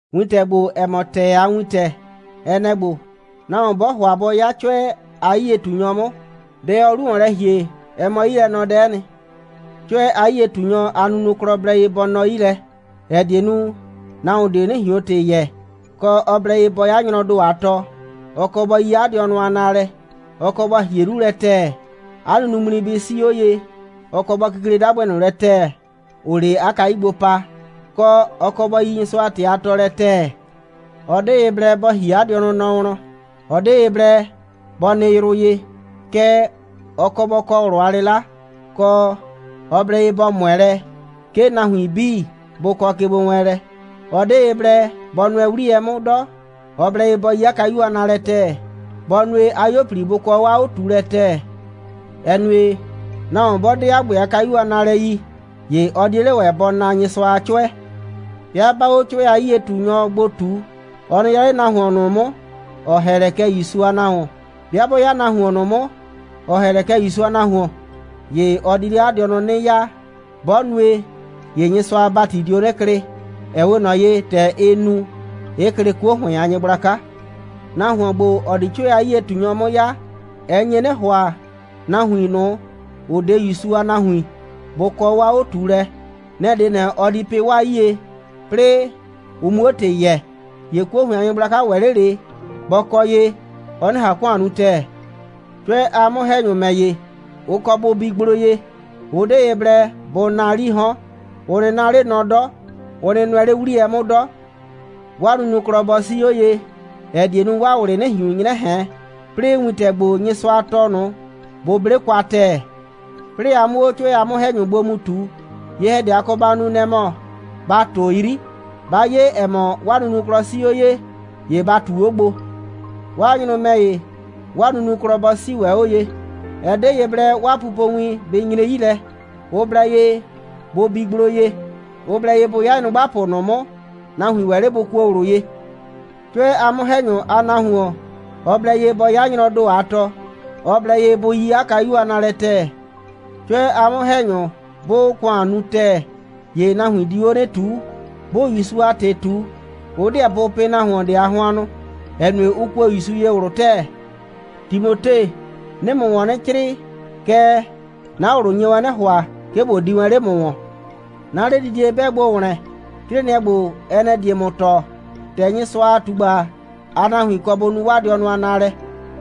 Wintɛ ‑gbo, ‑ɛ mɔ ‑tɛɛ a wintɛ, ɛ nɛ‑ ‑gbo: Nahuon 'bɔɔ ‑hʋa bɔ 'ya 'cʋɛ a 'yie꞊tunyɔ 'mʋ, dɛ ɔɔ 'lu ‑wɔn lɛ ‑hie, ɛ mɔ 'yilɛnɔdɛ'ɛ nɩ. 'Cʋɛ a 'yie꞊tunyɔ, 'a nunuklɔ blɛ ye bɔ nɔ 'yi lɛ, ‑ɛ die nu, nahuon ꞊de 'nɩ ꞊hion ‑tɩ yɛɛ, kɔ, ɔ blɛ ye bɔ 'ya nyrɔɔ ‑do a tɔ, ɔ kɔ bɔ yi 'a dɩɔnʋ a naalɛ, ɔ kɔ bɔ ‑hie 'lu lɛ ‑tɛɛ, 'a nunuŋmli bɩ 'sii 'o ye, ɔ kɔ bɔ kikle 'dagbɩ ꞊nʋ lɛ ‑tɛɛ, ‑ʋʋ 'le 'a kayu gbo pa, kɔ, ɔ kɔ bɔ yi Nyɩsʋa a ‑tɩ a tɔɔlɛ ‑tɛɛ, ɔ 'de ye blɛ bɔ ‑hie 'a dɩɔnʋ nɔ wlɔn, ɔ 'de ye blɛ bɔ nɩ yrʋ ye, kɛɛ, ɔ kɔ bɔ kɔ ꞊wlʋ a 'lɩla, kɔ, ɔ blɛ ye bɔ ꞊mʋɛ lɛ, 'ke nahuin 'bii bʋ kɔ kegbowɛɛnlɛ, ɔ 'de ye blɛ bɔ nʋɛ 'wliyɛ 'mʋ 'dɔ, ɔ blɛ ye bɔ yi 'a kayu a naalɛ ‑tɛɛ, bɔ nue, 'a 'yuo꞊pli bʋ kɔ 'o 'a 'o꞊tuulɛ ‑tɛɛ, ‑ɛ nue, nahuon 'bɔ 'de 'a ‑gbɛ a kayu a naalɛ yi, ‑ye ɔ 'die 'le ‑wɛ bɔ naa Nyɩsʋa a 'cʋɛ. 'Bɩa 'baa 'o 'cʋɛ a 'yie꞊tunyɔ gbo ꞊tu, ɔ nɩ 'ya 'le nahuon ꞊nʋ 'mʋ, ‑ɔ ‑hɛ lɛ kɛ ‑Yusu a nahuon. 'Bɩa 'bɔ 'ya nahuon ꞊nʋ 'mʋ, ‑ɔ ‑hɛ lɛ kɛ ‑Yusu a nahuon, ‑ye ɔ di 'le 'a dɩɔnʋ 'nɩ 'yaa. 'Bɔ nue, ‑ye Nyɩsʋa a ‑bati dio 'nɩ klɩ, ‑ɛ 'we ꞊nɔ ye, ‑tɛ ɩ nu, 'ɩ klɩ 'kuo ‑hʋɩn a nyɩgblaka. Nahuon ‑gbo, ‑ɔ di 'cʋɛ a 'yie꞊tunyɔ 'mʋ 'ya, ɛ nye 'nɩ ‑hʋa, nahuin ꞊nʋ, ‑ʋ 'de ‑Yusu a nahuin, bʋ kɔ 'o 'a 'o꞊tuulɛ. Nɛ‑ 'de ꞊nɛ, ɔ di pɩ 'waa 'yie, 'plɩɩ ʋ 'muo ‑tɩ yɛɛ, ‑ye 'kuo ‑hʋɩn a nyɩgblaka ‑wɛ 'le ꞊le bɔ kɔ ye, ɔ 'nɩ ꞊han ‑kʋan nu ‑tɛɛ. 'Cʋɛ a 'mʋ‑hɛnyʋ ‑mɛ ‑ye, ʋ kɔ bʋ bi gblo ye. Ʋ 'de ye blɛ bʋ naa 'lii 'hɔn. Ʋ nɩ 'na 'le nɔ 'dɔ. Ʋ nɩ nʋɛ 'le 'wliyɛ 'mʋ 'dɔ. 'Waa nunuklɔ bɔ 'sii 'o ye, ‑ɛ die nu, 'waa ꞊wlɩ 'nɩ ꞊hiun 'nyrɛ ꞊hɛn. 'Plɩɩ wintɛ ‑gbo, Nyɩsʋa tɔɔ ꞊nʋ, bʋ 'ble kwa ‑tɛɛ. 'Plɩɩ a 'mʋ 'o 'cʋɛ a 'mʋ‑hɛnyʋ gbo mu ꞊tu, ye‑hɛdɛ, a kɔ ba nu, nɛ‑ mɔ, ba ꞊tʋ 'yri. 'Ba 'ye, ‑ɛ mɔ, 'waa nunuklɔ 'sii 'o ye, ‑ye ba ꞊tu 'o gbo. 'Waa nyrʋ ‑mɛ ‑ye, 'waa nunuklɔ bɔ 'sii ‑wɛ 'o ye. Ɛ 'de ye blɛ 'waa pupowin bɩ nyre 'yi lɛ. Ʋ blɛ ye bʋ bi gblo ye. Ʋ blɛ ye bʋ 'ya nyrʋgbapʋ ꞊nʋ 'mʋ, nahuin ‑wɛ 'le bʋ kuo ꞊wlʋ ye. 'Cʋɛ a 'mʋ‑hɛnyʋ, 'a nahuon, ɔ blɛ ye bɔ 'ya nyrɔɔ ‑do a tɔ. Ɔ blɛ ye bʋ yi 'a kayu a naalɛ ‑tɛɛ. 'Cʋɛ a 'mʋ‑hɛnyʋ 'bʋʋ ‑kʋan nu ‑tɛɛ, ‑ye nahuin diu 'o 'nɩ ꞊tuu. 'Bʋʋ ‑Yusu a ‑tɩ ꞊tu, ʋ 'deɛ bʋ pɩ nahuon ꞊de a hʋannʋ, ‑ɛ nue, ʋ kuo ‑Yusu ye ꞊wlʋ ‑tɛɛ. Timote, 'nɩɩ ‑mʋ ‑wɔn 'nɩ 'crɩɩ, kɛɛ, 'na ꞊wlʋ nye wɛn 'nɩ ‑hʋa, 'ke ꞊bo di wɛn 'le ‑mʋ ‑wɔn. 'Na 'ledidie 'bɛɛ gbo ‑wlɛn, 'crɩɩnɩɛ ‑gbo, ɛ nɛ‑ die ‑mʋ tɔɔ, ‑tɛ Nyɩsʋa a ꞊tugba a nahuin kɔ bʋ nu 'waa dɩɔnʋ a naalɛ.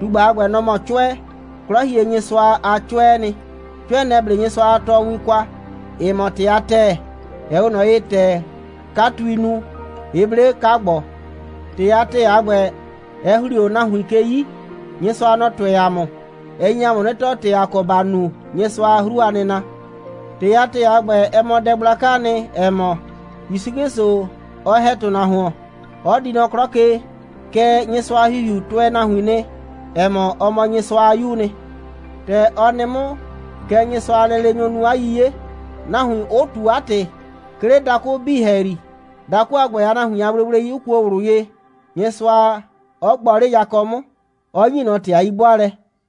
꞊Tugba a ‑gbɛ, nɔ‑ mɔ 'cʋɛ. 'Klɔhienyɩsʋa a 'cʋɛɛ nɩ. 'Cʋɛ, nɛ‑ 'ble Nyɩsʋa a tɔɔwin kwa, ‑ɩ mɔ ‑tɩ a ‑tɛɛ, ‑ɛ 'we ꞊nɔ ye, ‑tɛ 'katui nu, 'ɩ 'ble 'ka‑gbɔ. ‑Tɩ a ‑tɛɛ a ‑gbɛ, ɛ ‑hli o nahuin ke 'yi, Nyɩsʋa 'ɔ tʋɛ ‑a mʋ. Ɛ nye ‑a mʋ 'nɩ tɔɔ, ‑tɛ ‑a kɔ ‑ba nu Nyɩsʋa a 'hru a nɩna. ‑Tɩ a ‑tɛɛ a ‑gbɛ, ɛ mɔ dɛ gblakaa nɩ, ‑ɛ mɔ: ‑Yusu 'Klɩsʋ, ɔ ‑hɛ ‑tʋnahuon, 'ɔ di nɔ 'klɔ ke, kɛɛ, Nyɩsʋa a ‑Hihiu tʋɛ nahuin nɩ, ‑ɛ mɔ, ɔ mɔ Nyɩsʋa a 'Yuu nɩ. ‑Tɛ ɔ nɩ 'mʋ, kɛ Nyɩsʋa a lɛleenyʋ nu 'a 'yiye, nahuin 'ʋ ꞊tu 'a ‑tɩ, 'ke 'le dakʋ 'bii ‑hɛyri, dakʋ a ‑gbɛ a nahuin a gblegblei 'ʋ kuo ꞊wlʋ ye, Nyɩsʋa 'ɔ gbɔ 'le yakɔ 'mʋ, 'ɔ ‑nyi ꞊nɔ ‑tɩ a 'yi'bʋaalɛ.